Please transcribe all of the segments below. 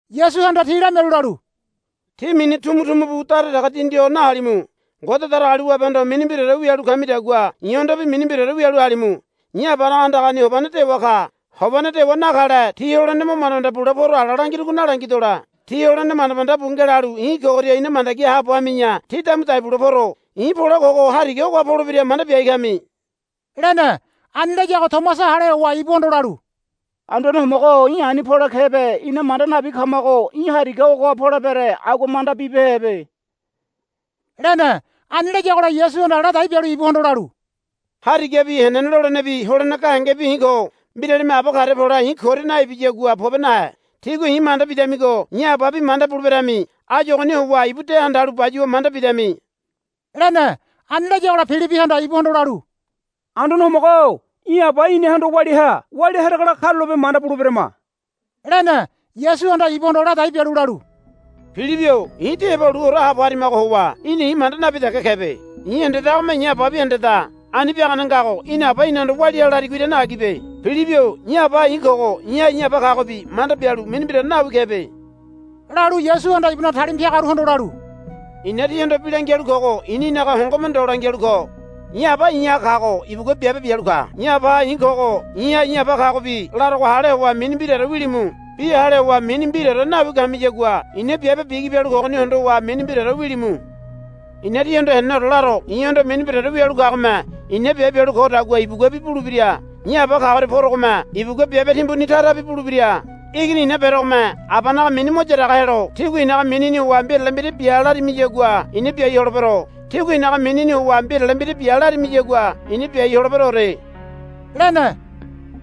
Yasuhanda ti lamialu lalu, Tí mini tumutumu bu dara dege dindi ho nahalimu. Ngode Datagaliwabehondo mini mbiraore wialu kamidagua i̱hondobi mini mbiraore wialu halimu. I̱ Abanaga andagani hobane dewa ka. Hobane dewa nakale tí holene mo manda manda bule poro ala langirugo nalangidole. Tí holene manda manda bu ngelalu i̱ kogoria ina mandagi haabo hami̱ya tí damu dai bule poro. I̱ pole kogo hariga ogoha polebira manda biai kami, lene. Ani layago Tomasa hale howa ibuhondo lalu, Anduane Homogo-o í̠ ani pole kebe ina manda nabi kamago í̠ hariga ogoha polebere agua manda bibehebe, lene. Ani layagola Yasuhanda ladai bialu ibuhondo lalu, Harigabi henene lolenebi holene gahengebi i̱ ko. Mbiralime Aba karia pole i̱ koria naibiyagua pobe nahe. Tígua i̱ manda bidamigo i̱ Ababi manda buleberami. Áyu ogoni howa ibu de handalu bayuwa manda bidami, lene. Ani layagola Pilibihanda ibuhondo lalu, Anduane Homogo-o í̠ Aba inahondo walia ha. Walia haregola karulape manda buleberama, lene. Yasuhanda ibuhondo ladai bialu lalu, Pilibi-o i̱ tí heba luore haabo harimago howa í̠na i̱ manda nabi dege kebe. I̱ hendedagome i̱ Ababi hendeda. Ani biagane ngago í̠na Aba inahondo walia ha larigo irane agibe. Pilibi-o i̱ Abaha i̱ kogo i̱ha i̱ Aba kagobi manda bialu mini mbiraore nawi kebe, lalu Yasuhanda ibunaga talima piagaruhondo lalu, I̱na tíhondo bi langialu kogo i̱ninaga hongome ndo langialu ko. I̱ Aba i̱ha kago ibugua biabe bialu ka. I̱ Abaha i̱ kogo i̱ha i̱ Aba kagobi larogo hale howa mini mbiraore wilimu. Bi hale howa mini mbiraore nawi kamiyagua i̱na biabe bigi bialu kogoni hondowa mini mbiraore wilimu. I̱na tíhondo heneneore laro. I̱hondo mini mbiraore wialu kagome i̱na biabe bialu kodagua ibuguabi bulebira. I̱ Aba kagoria porogome ibugua biabe timbuni tarabi bulebira. Igini i̱na berogome Abanaga mini mo yaraga helo tígua i̱naga minini howa mbirale mbira bia larimiyagua i̱na biai holebero. Tígua i̱naga minini howa mbirale mbira bia larimiyagua i̱na biai holeberoore, lene.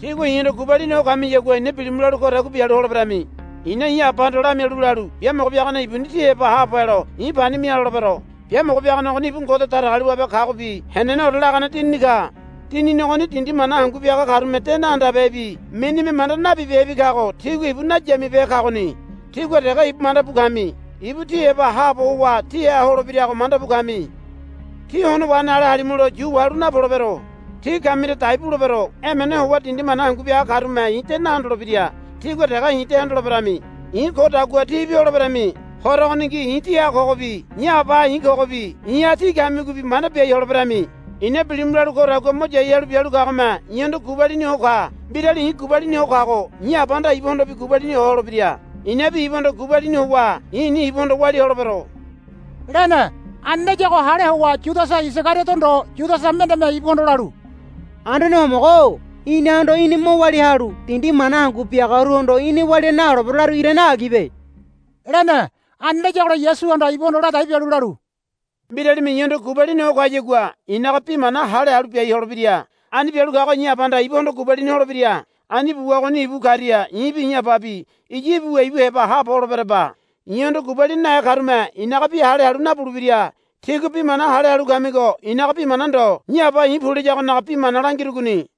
Tígua i̱hondo gubalini ho kamiyagua i̱na bilimu lalu kodagua bialu holeberami. I̱na i̱ Abahondo lamialu lalu, Biamogo Biagane ibuni tí heba haabo helo i̱ pani mia, lolebero. Biamogo Biagane ogoni ibu Ngode Datagaliwabe kagobi heneneore lagane Dinini ka. Dinini ogoni dindi mana hangu biaga karume de nahandabehebi minime manda nabibehebi kago tigua ibu nayamibehe kagoni. Tígua dege ibu mandabu kami. Ibu tí heba haabo howa tíha holebirago mandabu kami. Tí hono wahene ale halimulo yu wahalu napolebero. Tí kamiria i̱ dai bulebero. Emene howa dindi mana hangu biaga karume i̱ de nahondolebira. Tígua dege i̱ de hondoleberami. I̱ kodagua tíbi holeberami. Horo ogoningi i̱ tíha kogobi i̱ Abaha i̱ kogobi i̱ha tí kamigobi manda biai holeberami. I̱na bilimu lalu kodagua mo yai halu bialu kagome i̱hondo gubalini ho ka. Mbirali i̱ gubalini ho kago i̱ Abahanda ibuhondobi gubalini ho holebira. I̱nabi ibuhondo gubalini howa i̱ni ibuhondo walia holebero, lene. Ani layago hale howa Yudasa Isagariodo ndo Yudasa mendeme ibuhondo lalu, Anduane Homogo-o inahondo í̠ni mo walia halu dindi mana hangu biagaruhondo í̠ni walia naholebero larigo irane agibe, lene. Ani layagola Yasuhanda ibuhondo ladai bialu lalu, Mbiralime i̱hondo gubalini ho kayagua i̱naga bi mana hale halu biai holebira. Ani bialu kago i̱ Abahanda ibuhondo gubalini holebira. Ani buwa ogoni ibu karia i̱bi i̱ Ababi iya ibuwa ibu heba haabo holeberaba. I̱hondo gubalini nahe karume i̱naga bi hale halu nabulebira. Tígua bi mana hale halu kamigo i̱naga bi mana ndo i̱ Aba i̱ pu layagonaga bi mana langirugoni.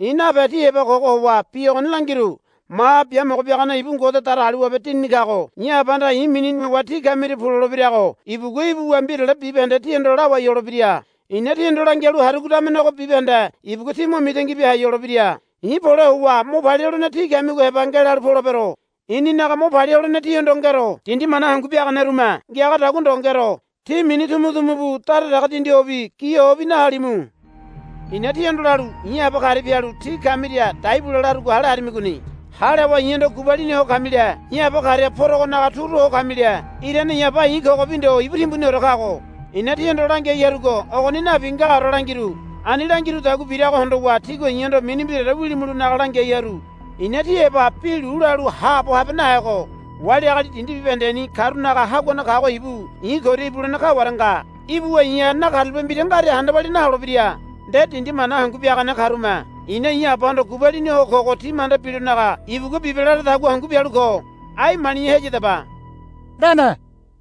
I̱ nape tí heba kogo howa bi ogoni langiru. Maha Biamogo Biagane ibu Ngode Datagaliwabe Dinini kago i̱ Abahanda i̱ minini howa tí kamiria pu lolebirago ibugua ibuwa mbirale bibahende tíhondo lawai holebira. I̱na tíhondo langialu harugo damenego bibahende ibugua tí mo mitangi bia hai holebira. I̱ pole howa mo palia holene tí kamigo heba ngelalu polebero. I̱ninaga mo palia holene tíhondo ngero. Dindi mana hangu biaganerume ngiagadagua ndo ngero. Tí mini tumutumu bu dara dege dindi hobi gi hobi nahalimu. I̱na tíhondo lalu i̱ Aba karia pialu tí kamiria dai bule larugo hale harimigoni. Hale howa i̱hondo gubalini ho kamile i̱ Aba karia porogonaga turu ho kamile. Irane i̱ Aba i̱ kogobi ndo ibu timbuniore kago. I̱na tíhondo langiai harugo ogoni nabi ngaore langiru. Ani langirudagua birago hondowa tígua i̱hondo mini mbiraore wilimulonaga langiai haru. I̱na tí heba bi lu lalu haabo habe nahego wali agali dindi bibahendeni karunaga haguane kago ibu i̱ koria ibulene kaware nga. Ibuwa i̱ha nakarulape mbira ngaria handa walia naholebira. Nde dindi mana hangu biagane karume i̱na i̱ Abahondo gubalini ho kogo ti manda bilonaga ibugua bibe laradagua hangu bialu ko. Ai mali̱ya heyadaba, lene.